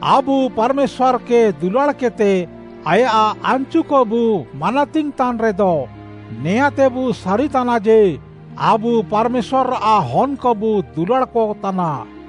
ଆବୁ ପାର୍‌ମେଶ୍ୱାର୍‌କେ ଦୁଲାଡ଼୍‌କେଦ୍‌ତେ ଆୟାଃ ଆନାଚୁକବୁ ମାନାତିଙ୍ଗ୍‌ତାନ୍‌ରେଦ, ନେଆଁଁତେବୁ ସାରିତାନା ଯେ, ଆବୁ ପାର୍‌ମେଶ୍ୱାର୍‌ଆଃ ହନ୍‌କବୁ ଦୁଲାଡ଼୍‌କ ତାନା।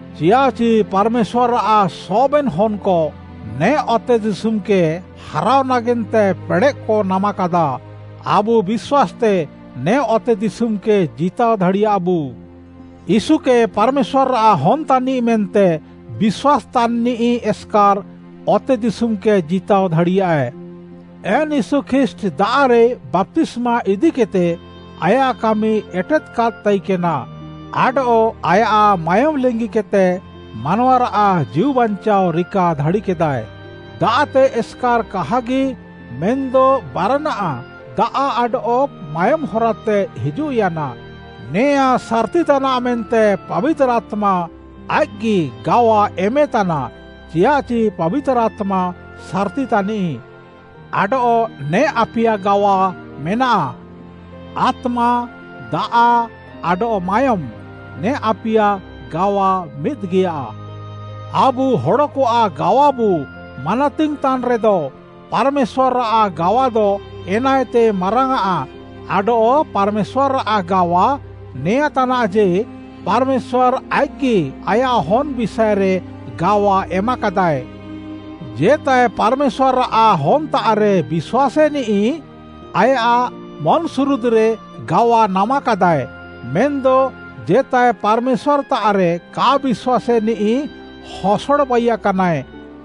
ଚିୟାଃଚି ପାର୍‌ମେଶ୍ୱାର୍‌ଆଃ ସବେନ୍‌ ହନ୍‌କ ନେ ଅତେଦିଶୁମ୍‌କେ ହାରାଅ ନାଗେନ୍ତେ ପେଡ଼େଃକ ନାମାକାଦା। ଆବୁ ବିଶ୍ୱାସ୍‌ତେ ନେ ଅତେଦିଶୁମ୍‌କେ ଜିତାଅ ଦାଡ଼ିୟାବୁ। ୟୀଶୁକେ ପାର୍‌ମେଶ୍ୱାର୍‌ଆଃ ହନ୍‌ ତାନିଃ ମେନ୍ତେ ବିଶ୍ୱାସ୍‌ତାନ୍‌ନିଃ ଏସ୍‌କାର୍‌ ଅତେଦିଶୁମ୍‌କେ ଜିତାଅ ଦାଡ଼ିୟାଏ। ଏନ୍‌ ୟୀଶୁ ଖ୍ରୀଷ୍ଟ୍‌ ଦାଆଃରେ ବାପ୍ତିସ୍ମା ଇଦିକେଦ୍‌ତେ ଆୟାଃ କାମି ଏଟେଦ୍‌କାଦ୍‌ ତାଇକେନା, ଆଡଃ ଆୟାଃ ମାୟୋମ୍‌ ଲିଙ୍ଗିକେଦ୍‌ତେ ମାନୱାରାଃ ଜୀଉବାଞ୍ଚାଅ ରିକା ଦାଡ଼ିକେଦାଏ। ଦାଆଃତେ ଏସ୍‌କାର୍‌ କାହାଗି ମେନ୍‌ଦ ବାରାନାଃ ଦାଆଃ ଆଡଃ ମାୟୋମ୍‌ ହରାତେ ହିଜୁଃୟାନା। ନେଆଁଁ ସାର୍‌ତି ତାନାଃ ମେନ୍ତେ ପାବିତାର୍‌ ଆତ୍ମା ଆଇଃକ୍‌ଗି ଗାୱା ଏମେତାନା, ଚିୟାଃଚି ପାବିତାର୍‌ ଆତ୍ମା ସାର୍‌ତି ତାନିଃ। ଆଡଃ ନେ ଆପିୟା ଗାୱା ମେନାଃ: ଆତ୍ମା, ଦାଆଃ, ଆଡଃ ମାୟୋମ୍‌, ନେ ଆପିୟା ଗାୱା ମିଦ୍‌ଗିୟା। ଆବୁ ହଡ଼କଆଃ ଗାୱାବୁ ମାନାତିଙ୍ଗ୍‌ତାନ୍‌ରେଦ, ପାର୍‌ମେଶ୍ୱାର୍‌ଆଃ ଗାୱାଦ ଏନାଏତେ ମାରାଙ୍ଗ୍‌ଆଃ, ଆଡଃ ପାର୍‌ମେଶ୍ୱାର୍‌ଆଃ ଗାୱା ନେଆଁ ତାନାଃ ଯେ, ପାର୍‌ମେଶ୍ୱାର୍‌ ଆଇଃକ୍‌ଗି ଆୟାଃ ହନ୍‌ ବିଷାଏରେ ଗାୱା ଏମାକାଦାଏ। ଜେତାଏ ପାର୍‌ମେଶ୍ୱାର୍‌ଆଃ ହନ୍‌ତାଃରେ ବିଶ୍ୱାସେନିଃ, ଆୟାଃ ମନ୍‌ସୁରୁଦ୍‌ରେ ଗାୱା ନାମାକାଦାଏ, ମେନ୍‌ଦ ଜେତାଏ ପାର୍‌ମେଶ୍ୱାର୍‌ତାଃରେ କା ବିଶ୍ୱାସେନିଃ ହସଡ଼ ବାଇୟାକାନାଏ,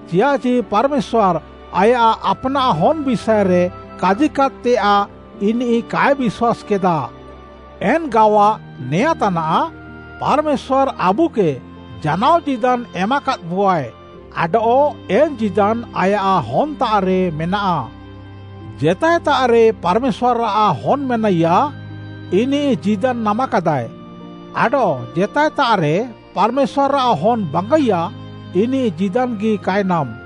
ଚିୟାଃଚି ପାର୍‌ମେଶ୍ୱାର୍‌ ଆୟାଃ ଆପ୍‌ନାଃ ହନ୍‌ ବିଷାଏରେ କାଜିକାଦ୍‌ତେୟାଃ ଇନିଃ କାଏ ବିଶ୍ୱାସ୍‌କେଦା। ଏନ୍‌ ଗାୱା ନେଆଁଁ ତାନାଃ, ପାର୍‌ମେଶ୍ୱାର୍‌ ଆବୁକେ ଜାନାଅ ଜୀଦାନ୍‌ ଏମାକାଦ୍‌ବୁଆଏ, ଆଡଃ ଏନ୍‌ ଜୀଦାନ୍‌ ଆୟାଃ ହନ୍‌ତାଃରେ ମେନାଃ। ଜେତାଏତାଃରେ ପାର୍‌ମେଶ୍ୱାର୍‌ଆଃ ହନ୍‌ ମେନାଇୟା, ଇନିଃ ଜୀଦାନ୍‌ ନାମାକାଦାଏ, ଆଡଃ ଜେତାଏତାଃରେ ପାର୍‌ମେଶ୍ୱାର୍‌ଆଃ ହନ୍‌ ବାଙ୍ଗାଇୟା, ଇନିଃ ଜୀଦାନ୍‌ଗି କାଏ ନାମ୍‌।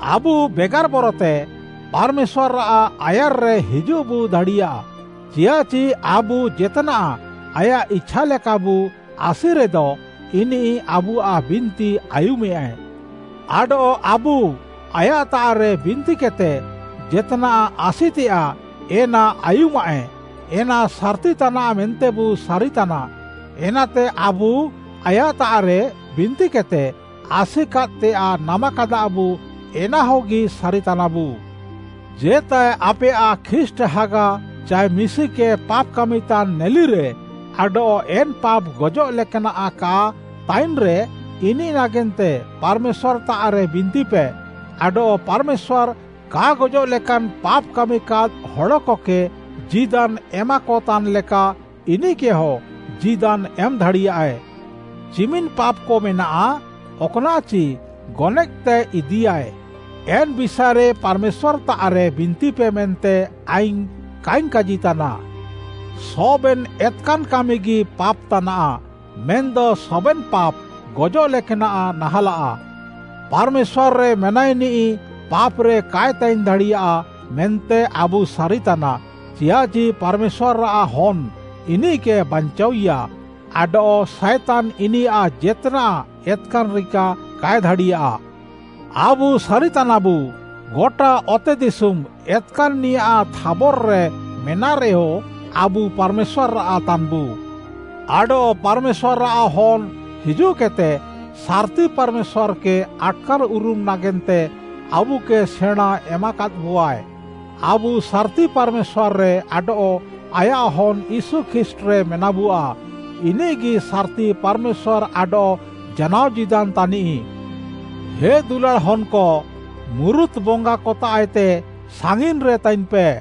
ଆବୁ ବେଗାର୍‌ ବରତେ ପାର୍‌ମେଶ୍ୱାର୍‌ଆଃ ଆୟାର୍‌ରେ ହିଜୁଃବୁ ଦାଡ଼ିୟା, ଚିୟାଃଚି ଆବୁ ଜେତ୍‌ନାଃ ଆୟାଃ ଇଛା ଲେକାବୁ ଆସିରେଦ, ଇନିଃ ଆବୁଆଃ ବିନ୍ତି ଆୟୁମେୟାଏ। ଆଡଃ ଆବୁ ଆୟାଃତାଃରେ ବିନ୍ତିକେଦ୍‌ତେ ଜେତ୍‌ନାଃ ଆସିତେୟାଃ ଏନା ଆୟୁମାଃଏ, ଏନା ସାର୍‌ତି ତାନାଃ ମେନ୍ତେବୁ ସାରିତାନା। ଏନାତେ ଆବୁ ଆୟାଃତାଃରେ ବିନ୍ତିକେଦ୍‌ତେ ଆସିକାଦ୍‌ତେୟାଃ ନାମାକାଦାବୁ ଏନାହଗି ସାରିତାନାବୁ। ଜେତାଏ ଆପେୟାଃ ଖ୍ରୀଷ୍ଟ୍‌ ହାଗା ଚାଏ ମିଶିକେ ପାପ୍‌ କାମିତାନ୍‌ ନେଲିରେ ଆଡଃ ଏନ୍‌ ପାପ୍‌ ଗଜଃ ଲେକାନାଃ କା ତାଇନ୍‌ରେ, ଇନିଃ ନାଗେନ୍ତେ ପାର୍‌ମେଶ୍ୱାର୍‌ତାଃରେ ବିନ୍ତିପେ, ଆଡଃ ପାର୍‌ମେଶ୍ୱାର୍‌ କା ଗଜଃଲେକାନ୍‌ ପାପ୍‌ କାମିକାଦ୍‌ ହଡ଼କକେ ଜୀଦାନ୍‌ ଏମାକତାନ୍‌ଲେକା, ଇନିଃକେହଁ ଜୀଦାନ୍‌ ଏମ୍‌ଦାଡ଼ିୟାଏ। ଚିମିନ୍‌ ପାପ୍‌କ ମେନାଃ ଅକ୍‌ନାଃଚି ଗନଏଃତେ ଇଦିୟାଏ, ଏନ୍‌ ବିଷାଏରେ ପାର୍‌ମେଶ୍ୱାର୍‌ତାଃରେ ବିନ୍ତିପେ ମେନ୍ତେ ଆଇଙ୍ଗ୍‌ କାଇଙ୍ଗ୍‌ କାଜିତାନା। ସବେନ୍‌ ଏତ୍‌କାନ୍‌ କାମିଗି ପାପ୍‌ ତାନାଃ, ମେନ୍‌ଦ ସବେନ୍‌ ପାପ୍‌ ଗଜଃଲେକାନାଃ ନାହାଁଲାଃ। ପାର୍‌ମେଶ୍ୱାର୍‌ରେ ମେନାଇନିଃ ପାପ୍‌ରେ କାଏ ତାଇନ୍‌ ଦାଡ଼ିୟା ମେନ୍ତେ ଆବୁ ସାରିତାନା, ଚିୟାଃଚି ପାର୍‌ମେଶ୍ୱାର୍‌ଆଃ ହନ୍‌ ଇନିଃକେ ବାଞ୍ଚାଅଇୟା, ଆଡଃ ସାଏତାନ୍‌ ଇନିୟାଃ ଜେତ୍‌ନାଃ ଏତ୍‌କାନ୍‌ ରିକା କାଏ ଦାଡ଼ିୟା। ଆବୁ ସାରିତାନାବୁ, ଗଟା ଅତେଦିଶୁମ୍‌ ଏତ୍‌କାନ୍‌ନିଆଃ ଥାବର୍‌ରେ ମେନାଃରେୟ, ଆବୁ ପାର୍‌ମେଶ୍ୱାର୍‌ଆଃ ତାନ୍‌ବୁ। ଆଡଃ ପାର୍‌ମେଶ୍ୱାର୍‌ଆଃ ହନ୍‌ ହିଜୁଃକେଦ୍‌ତେ ସାର୍‌ତି ପାର୍‌ମେଶ୍ୱାର୍‌କେ ଆଟ୍‌କାର୍‌ଉରୁମ୍‌ ନାଗେନ୍ତେ ଆବୁକେ ସେଣାଁଁ ଏମାକାଦ୍‌ବୁଆଏ। ଆବୁ ସାର୍‌ତି ପାର୍‌ମେଶ୍ୱାର୍‌ରେ ଆଡଃ ଆୟାଃ ହନ୍‌ ୟୀଶୁ ଖ୍ରୀଷ୍ଟ୍‌ରେ ମେନାବୁଆ। ଇନିଃଗି ସାର୍‌ତି ପାର୍‌ମେଶ୍ୱାର୍‌ ଆଡଃ ଜାନାଅ ଜୀଦାନ୍‌ ତାନିଃ। ହେ ଦୁଲାଡ଼୍‌ ହନ୍‌କ, ମୁରୁତ୍‌ ବଙ୍ଗାକତାଃଏତେ ସାଙ୍ଗିନ୍‌ରେ ତାଇନ୍‌ପେ।